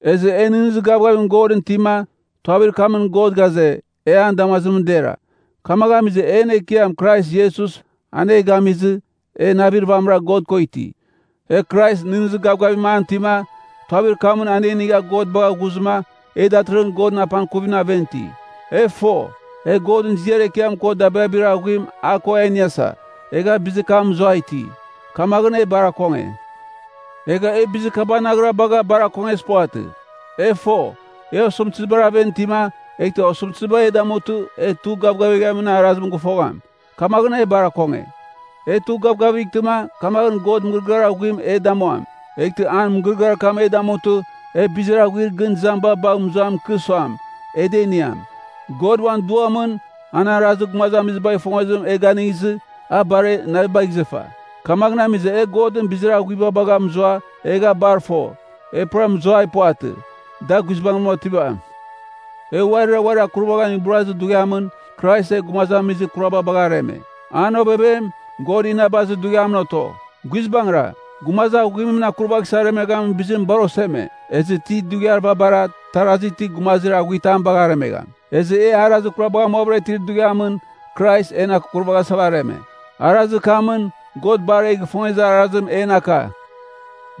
Ezɨ e nɨghnɨzir gavgavim Godɨn itima, tuavir kamɨn God ghaze, e an damazimɨn dera. Kamaghɨn amizɨ en Ekiam Krais Iesus an e gamizɨ, e navir vamɨra God ko iti. E Krais nɨghnɨzir gavgavim an itima, tuavir kamɨn an e inigha God bagha ghuzɨma, e datɨrɨghɨn Godɨn apangkuvimɨn aven iti. E fo, e Godɨn ziar ekiam ko dabirabir aghuim a ko a iniasa, egha bizir kam mɨzuai iti, kamaghɨn e bar akonge. Egha e bizir kabanaghra bagha bar akongezir puvatɨ. E fo, e osɨmtɨzibar aven itima, eghtɨ osɨmtɨziba e damutɨ, e tugh gavgavighamin arazim gɨfogham. Kamaghɨn e bar akonge. E tugh gavgavightɨ, kamaghɨn God mɨgɨrɨgɨar aghuim e damuam. Eghtɨ an mɨgɨrɨgɨar kam e damutɨ, e bizir aghuir gɨn izamiba bagh mɨzuam ikɨ suam, e da iniam. God uan Duamɨn, an arazir gumazamizibagh ifongezim e gingezɨ, a bar en navibagh izɨfa. Kamaghɨn amizɨ e Godɨn bizir aghuiba bagha mɨzua, egha bar fo, e pura mɨzuai puvatɨ, da guizbangɨra otivam. E uarira uarir akurvaghan iburazir dughiamɨn, Krais e gumazamizir kuraba bagha areme. An ovevem, God inabazir dughiamɨn oto. Guizbangɨra, gumazir aghuimɨn akurvaghsɨ aremeghamin bizim bar oseme. Ezɨ ti dughiar vabara, tarazi ti, gumazir aghuitam bagh aremegham. Ezɨ e arazir kurabagh amuavɨra itir dughiamɨn Krais, en akurvaghasa areme. Arazir kamɨn, God bar e gifongezir arazim en aka.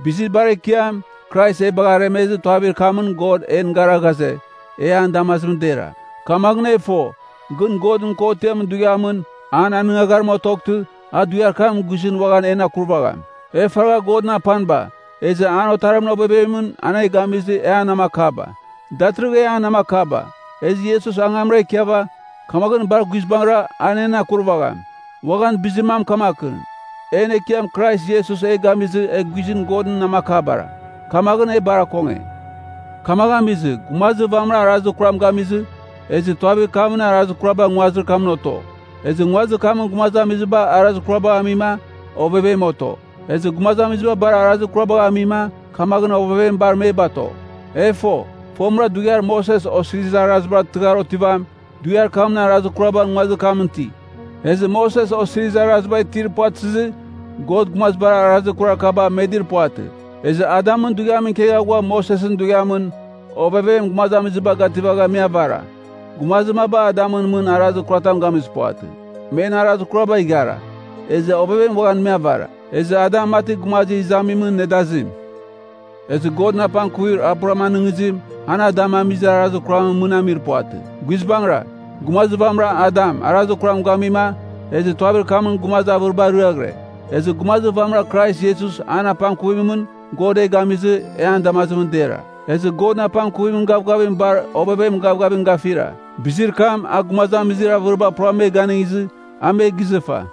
Bizir bar ekiam, Krais e bagh aremezɨ, tuavir kamɨn God en gara ghaze, ia nan damazimɨn dera. Kamaghɨn e fo, gɨn Godɨn kotiamɨn dughiamɨn an anɨngagharim otoghtɨ, a dughiar kam guizɨn uaghan en akurvagham. E faragha Godɨn apaniba, ezɨ an Otarimɨn ovevemɨn an e gamizɨ e an namakaba. Datɨrɨghɨn e an namakaba, ezɨ Iesus angamra ikiava, kamaghɨn bar guizbangɨra a en akurvagham. Uaghan bizir mam kamakɨn, en Ekiam Krais Iesus e gamizɨ e guizɨn Godɨn namakabara, kamaghɨn e bar akonge. Kamaghɨn amizɨ, gumazir vamɨra arazir kuram gamizɨ, ezɨ tuavir kamɨn arazir kuraba nguazir kamɨn oto. Ezɨ nguazir kamɨn gumazamiziba arazir kurabagh amima, ovevem oto. Ezɨ gumazamiziba bar arazir kurabagh amima, kamaghɨn ovevem bar me bato. E fo, fomɨra dughiar Moses Osirizir Arazibar tɨghar otivam, dughiar kamɨn arazir kuraba nguazir kamɨn iti. Ezɨ Moses Osirizir Araziba itir puvatɨzɨ, God gumazibar arazir kurar kaba medir puvatɨ. Ezɨ Adamɨn dughiamɨn ikegha ghua Mosesɨn dughiamɨn, ovevem gumazamiziba gativagha me avara. Gumazir maba Adamɨn mɨn arazir kuratam gamizir puvatɨ, men arazir kuraba ighara. Ezɨ ovevem uaghan me avara. Ezɨ Adam mati Gumazir Izamimɨn nedazim. Ezɨ Godɨn apangkuvir a pura anɨngizim, an Adam amizir arazir kuramɨn mɨn amir puvatɨ. Guizbangɨra, gumazir vamɨra Adam arazir kuram gamima, ezɨ tuavir kamɨn gumazir avɨriba ariaghɨre. Ezɨ gumazir vamɨra Krais Iesus an apangkuvimɨn, God e gamizɨ, e an damazimɨn dera. Ezɨ Godɨn apangkuvimɨn gavgavim bar ovevemɨn gavgavim gafira. Bizir kam, a gumazamizir avɨriba pura me ganɨngizɨ, a me gizɨfa!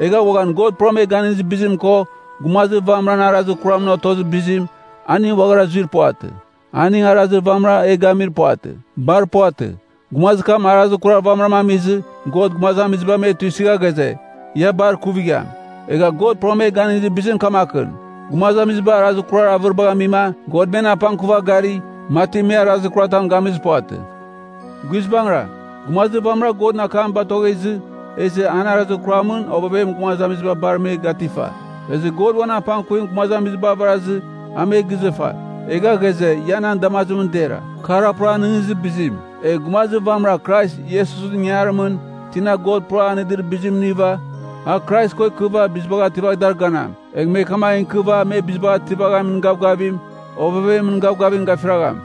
Egha uaghan God puram e ganɨngizir bizim ko, gumazir vamɨran arazir kuramɨn otozir bizim, aning uaghara zuir puvatɨ. Aning arazir vamɨra e gamir puvatɨ. Bar puvatɨ. Gumazir kam arazir kurar vamɨra amizɨ, God gumazamiziba me tuisɨgha ghaze, ia bar ikuvigham. Egha God puram e ganɨngizir bizim kamakɨn, gumazamiziba arazir kurar avɨribagh amima, God men apangkuva gari, mati me arazir kuratam gamizir puvatɨ. Guizbangɨra, gumazir vamɨra Godɨn akam batoghezɨ, ezɨ an arazir kuramɨn ovevem gumazamiziba bar me gatifa. Ezɨ God uan apangkuvim gumazamiziba avarazɨ a me gizɨfa, egha ghaze, ia nan damazimɨn dera. Kar a pura anɨngizir bizim. Egh gumazir vamɨra Krais Iesusɨn ingangarimɨn, tina God pura anɨdir bizim iniva, a Krais ko ikɨva bizibagh ativagh dar ganam. Egh me kamagh ikɨva me bizibagh ativaghamin gavgavim, ovevemɨn gavgavim gafiragham.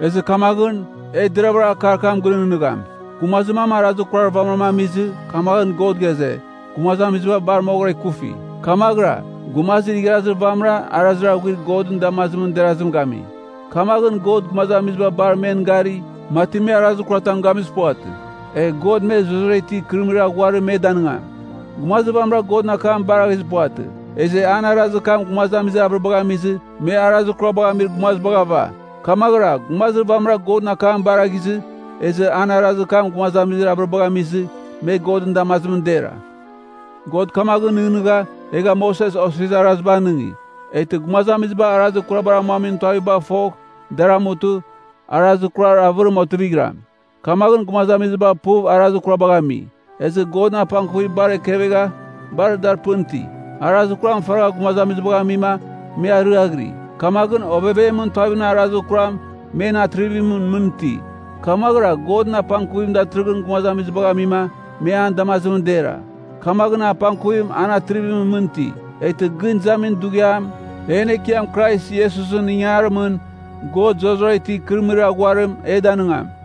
Ezɨ kamaghɨn, e deravɨra akar kam gɨnɨghnɨgham. Gumazir mam arazir kurar vamɨram amizɨ, kamaghɨn God ghaze, gumazamiziba bar moghɨra bar ikufi. Kamaghɨra, Gumazir Igharazir Vamɨra arazir aghuir Godɨn damazimɨn derazim gami. Kamaghɨn God gumazamiziba bar men gari, mati me arazir kuratam gamizir puvatɨ. Egh God me zurara itir ikɨrɨmɨrir aghuarim me danɨngam. Gumazir vamɨra Godɨn akam baraghizir puvatɨ, ezɨ an arazir kam gumazamizir avɨribagh amizɨ, me arazir kurabagh amir gumazibagh ava. Kamaghɨra Gumazir Vamɨra Godɨn akam baraghizɨ, ezɨ an arazir kam gumazamizir avɨribagh amizɨ, me Godɨn damazimɨn dera. God kamaghɨn nɨghnɨgha, egha Moses Osirizir Araziba anɨngi, eghtɨ gumazamiziba arazir kurabar amuamin tuavibagh fogh dar amutɨ, arazir kurar avɨrim otivighram. Kamaghɨn gumazamiziba puv arazir kurabagh ami, ezɨ Godɨn apangkuvim bar ekevegha, bar dar pɨn iti. Arazir kuram faragha gumazamizibagh amima me ariaghɨri, kamaghɨn ovevemɨn tuavimɨn arazir kuram men atrivimɨn mɨn iti. Kamaghɨra Godɨn apangkuvim datɨrɨghɨn gumazamizibagh amima, me an damazimɨn dera. Kamaghɨn apangkuvim en atrivimɨn mɨn iti. Eghtɨ gɨn izamin dughiam, en Ekiam Krais Iesusɨn ingarimɨn, God zurara itir ikɨrɨmɨrir aghuarim e danɨngam.